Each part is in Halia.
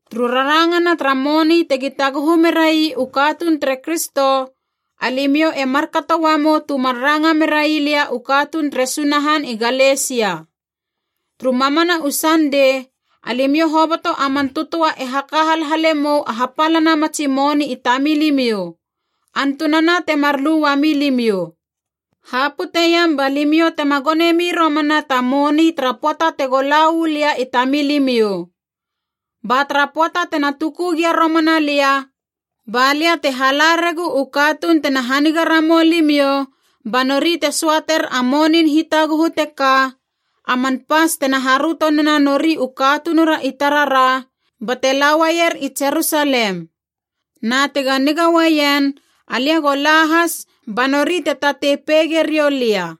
Turu rarangana tara moni tegi taguhu merai u katuun tere Kristo, alimiou e markato uamou tu mar ranga merai lia u katuun tere Sunahan i Galesia. Turu mamana u Sandei, alimiou hoboto a man tötöa e haka halhale mou a hapalana matsi moni i tamilimiou, antunana temar lu uami limiou. Haputeiam ba limiou tema gonemi romana ta moni tara pöata tego la uu lia i tamilimiou. Ba tara pöata tena tuku gia romana lia, ba lia te hala regu u katuun tena haniga ramou limiou ba nori te söater a monin hitaguhu teka, a man pas tena haröto nena nori u katunura i tarara, bate lauaier i Jerusalem. Na tega niga uaien alia go la has, ba nori te tatei peige riou lia.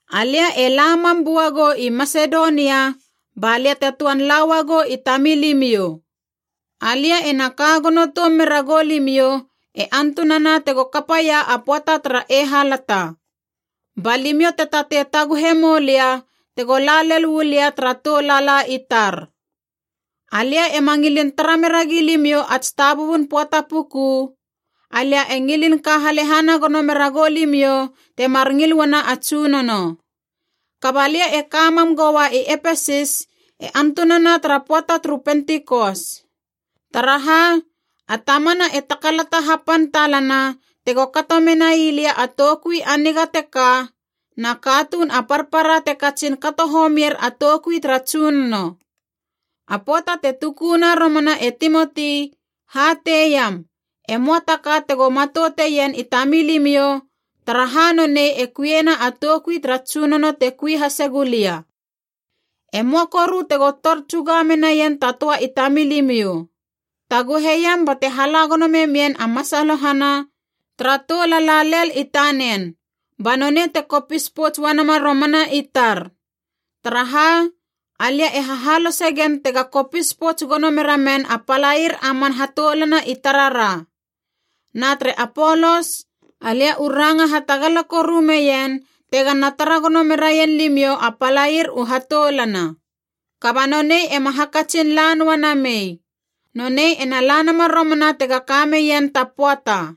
Alia e la mam buagou i Masedonia, ba lia te töan la uagou i tamilimiou. Alia ena ka gono toum mera goulimiou e antunana tego kapaia a pöata tara eihalata. Ba limiou te tatei taguhe moulia tego la lel uu lia tara tou lala i tar. Alia ema ngilin tara meragi limiou ats tabubun pöata puku, alia e ngilin ka halehana gono mera goulimiou, temar ngil uana a Tsunono. Kaba lia e ka mam goua i Epesis e antunana tara pöata turu Pentikos. Taraha, a tamana e takalata hapan talana tego kato menai lia a toukui a niga teka, na katuun a parpara te katsin kato homier a toukui tara Tsunono. A pöata te tukuna romana e Timoti hateiam, e möa ta ka tego matouteien i tamilimiou, taraha nonei e kuiena a toukui tara Tsunono te kui hasegu lia. E möa koru tego tor tsuga menaien ta töa i tamilimiou. Taguheiam bate hala gono memien a masalohana tara tou lala lel i tanen, ba nonei te kopis pouts uanama romana i tar. Taraha, alia e hahalose gen tega kopis pouts gono mera men a palair a man hatoulana i tarara. Na tere Apolos, alia u ranga hatagala koru meien tegana tara gono meraien limiou a palair u hatoulana. Kaba nonei ema hakatsin la noa namei. Nonei ena la nama romana tega ka meien ta pöata.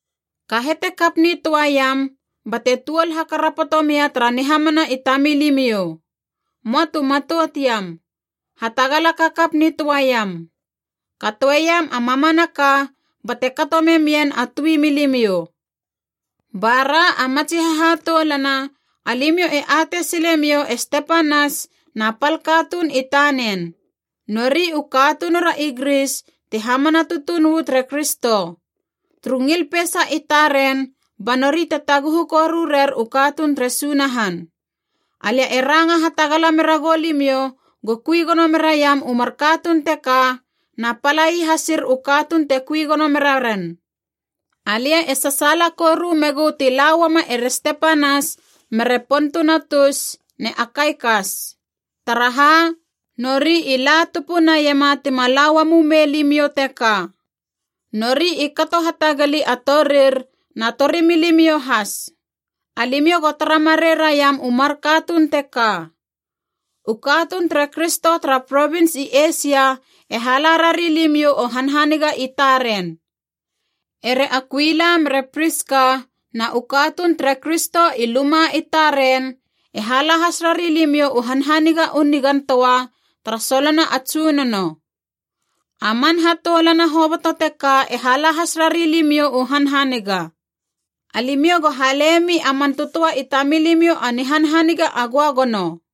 Kahete kap nitöaiam, bate tuol hakarapoto mia tara nihamana i tamilimiou. Möa tu matout iam, hatagala kakap nitöaiam. Katoeiam a mamanaka bate kato memien a tui milimiou. Bara a matsi hahatoulana alimiou e atei silemiou e Stepanas na pal katuun i tanen. Nori u katunura i Gris ti hamana tutuun uu tere Kristo. Turu ngil peisa i taren ba nori te taguhu koru rer u katuun tere Sunahan. Alia e ranga hatagala meragou limiou go kui gono meraiam u mar katuun teka na palai hasir u katuun te kui gono mera ren. Alia e sasaala koru megu ti la uama ere Stepanas mere Potunatus ne Akaikas. Taraha, nori i la tupu naiema tima la uamumei limiou teka. Nori i kato hatagali a torir na torimilimiou has. Alimiou go tara marei raiam u mar katuun teka. U katuun tere Kristo tara provins i Eisia e hala rari limiou u hanhaniga i taren. Ere Akuila mere Priska na u katuun tere Kristo i luma i taren e hala has rari limiou u hanhaniga u nigan töa tara solona a Tsunono. A man hatoulana hoboto teka e hala has rari limiou u hanhaniga. Alimiou go halemi a man tötöa i tamilimiou a nihanhaniga a göagono.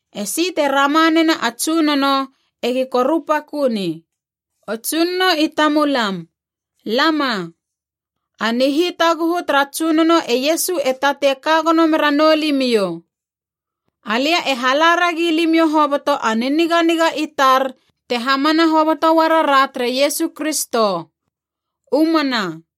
Esi te rama nena a Tsunono, egi korupakö ni. O Tsunono i tamulam, lama! A nihitaguhu tara Tsunono e Iesu e tatei ka gono mera noulimiou. Alia e hala ragi limiou hoboto a niniganiga i tar te hamana hoboto uara ra tere Iesu Kristo. U mana.